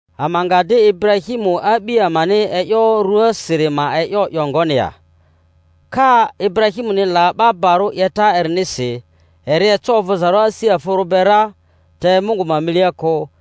Ama nga di Iburahimu a'bi amani e'yo rᴜasiri ma e'yo 'yo ngoni ya? Ka Iburahimuni la 'ba barᴜ 'yeta erinisi, eri eco ovᴜzarᴜ asi afᴜrᴜ be ra, te Mungu ma milia kᴜ.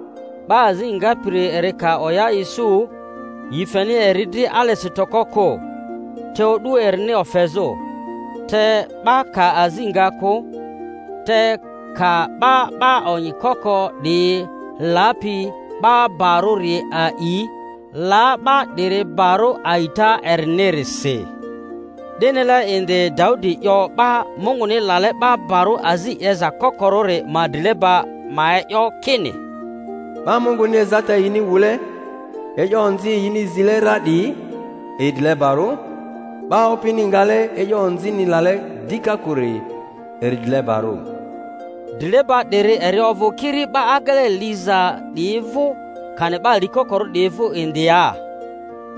'Ba azi ngapiri eri ka oya isu, yi feni eri dri alesi toko kᴜ, te odu erini ofezᴜ. Te 'ba ka azi nga kᴜ, te ka 'ba 'ba onyi koko 'diyi lapi 'ba barᴜri a'i, la 'ba 'diri barᴜ a'ita erinirisi. 'Di-nile indi Daudi 'yo 'ba Munguni lale 'ba barᴜ azi 'yeza kokorᴜri ma drileba ma e'yo, kini: 'Ba Munguni ezata yini wule, e'yo onzi yini zile ra 'diyi, yi drilebarᴜ; 'ba Opini ngale e'yo onzini lale dika kᴜri eri drilebarᴜ. Drileba 'diri eri ovᴜ kiri 'ba agele liza 'diyi vᴜ, kani 'ba likokorᴜ 'diyi vᴜ indi ya?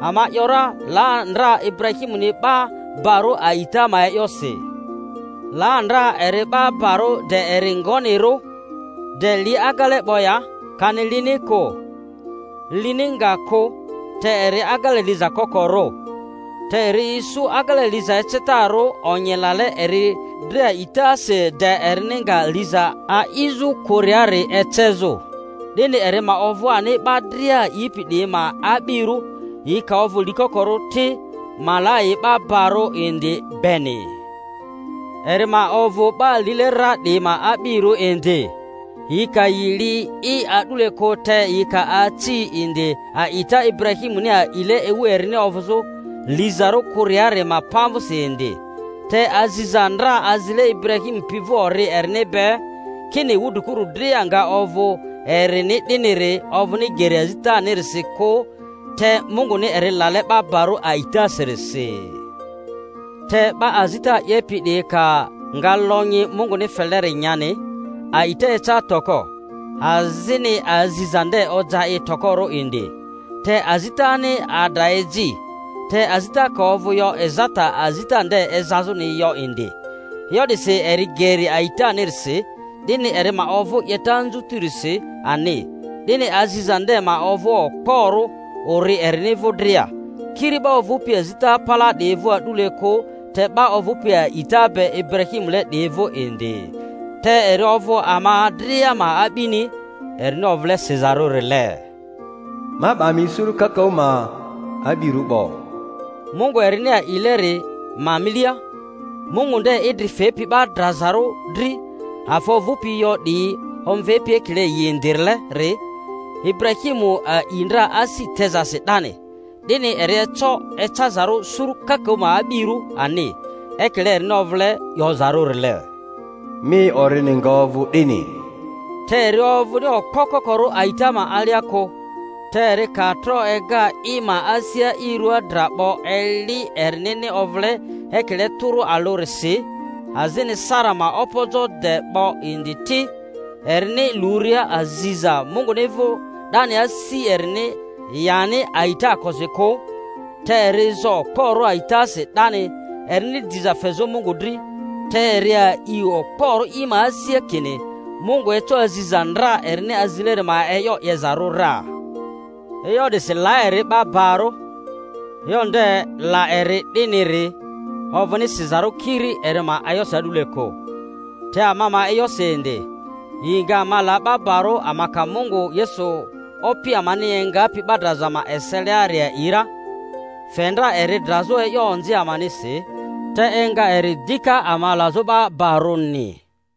Ama ‘yora, la ndra Iburahimuni 'ba barᴜ a'ita ma e'yosi. La ndra eri 'ba barᴜ de eri ngonirᴜ? De li agele 'bo ya, kani lini kᴜ? Lini nga kᴜ, te eri agele liza kokorᴜ. Te eri isu agele liza ecetarᴜ onyi lale eri dri a'itasi de erini nga liza a'izᴜ kᴜriari ecezᴜ. 'Dini eri ma ovᴜ ani 'ba dria a'ipi 'diyi ma a'birᴜ, yi ka ovᴜ likokorᴜ ti, ma la yi 'ba barᴜ indi beni; eri ma ovᴜ 'ba lile ra 'diyi ma a'birᴜ indi, yi ka yi li'i a'dule kᴜ, te yi ka aci indi a'ita Iburahimuni a'ile ewu erini ovᴜzᴜ lizarᴜ kᴜriari ma pamvᴜsi indi. Te aziza ndra azile Iburahimu pi vᴜ ori erini be, kini wudrikuru dria nga ovᴜ erini 'diniri, ovᴜni geri azitanirisi kᴜ te Munguni eri lale 'ba barᴜ a'itasirisi. Te 'ba azita 'yepi 'diyi ka nga lonyi Munguni feleri nyani, a'ita eca toko, azini aziza nde oja i tokorᴜ indi. Te azitani adra eji, te azita ka ovᴜ yo ezata azita nde ezazᴜri yo indi. E'yo 'disi eri geri a'itanirisi, 'dini eri ma ovᴜ 'yeta anzutirisi ani, 'dini aziza nde ma ovᴜ okporᴜ ori erini vᴜ dria—kiri 'ba ovᴜpi azita palaa 'diyi vᴜ a'dule kᴜ te 'ba ovᴜpi a'ita be Iburahimule 'diyi vᴜ indi, te eri ovᴜ ama dria ma a'bini, erini ovᴜle sizarᴜrile, Ma 'ba mi suru kakaᴜ ma a'birᴜ 'bo— Mungu erini a'ileri ma milia, Mungu nde idri fepi 'ba drazarᴜ dri, afa ovᴜpi yo 'diyi omvepi ekile yi indirileri. Ibu-rahimu a'i ndra asi tezasi 'dani, 'dini eri eco ecazarᴜ suru kakaᴜ ma a'birᴜ ani; ekile erini ovᴜle 'yozarᴜrile, Mi orini nga ovᴜ 'dini. Te eri ovᴜni okpo kokorᴜ a'ita ma alia kᴜ, te eri ka tro ega i ma asia i rua dra 'bo eli erinini ovᴜle ekile tᴜrᴜ alᴜrisi, azini Sara ma opojo de 'bo indi ti; erini luria aziza Munguni vᴜ 'dani asi erini yani a'itaakosi kᴜ, te eri zo okporᴜ a'itasi 'dani erini diza fezᴜ Mungu dri, te eri a'i okporᴜ i ma asia kini Mungu eco aziza ndra erini azileri ma e'yo 'yezarᴜ ra. E'yo 'disi, la eri 'ba barᴜ. E'yo nde, la eri 'diniri, ovᴜni sizarᴜ kiri eri ma e'yosi a'dule kᴜ, te ama ma e'yosi indi. Yi nga ama la 'ba barᴜ ama ka Mungu Yesu Opi amani engapi 'ba draza ma ese-liari a'i ra; fe ndra eri drazᴜ e'yo onzi amanisi, te enga eri dika ama lazᴜ 'ba barᴜni.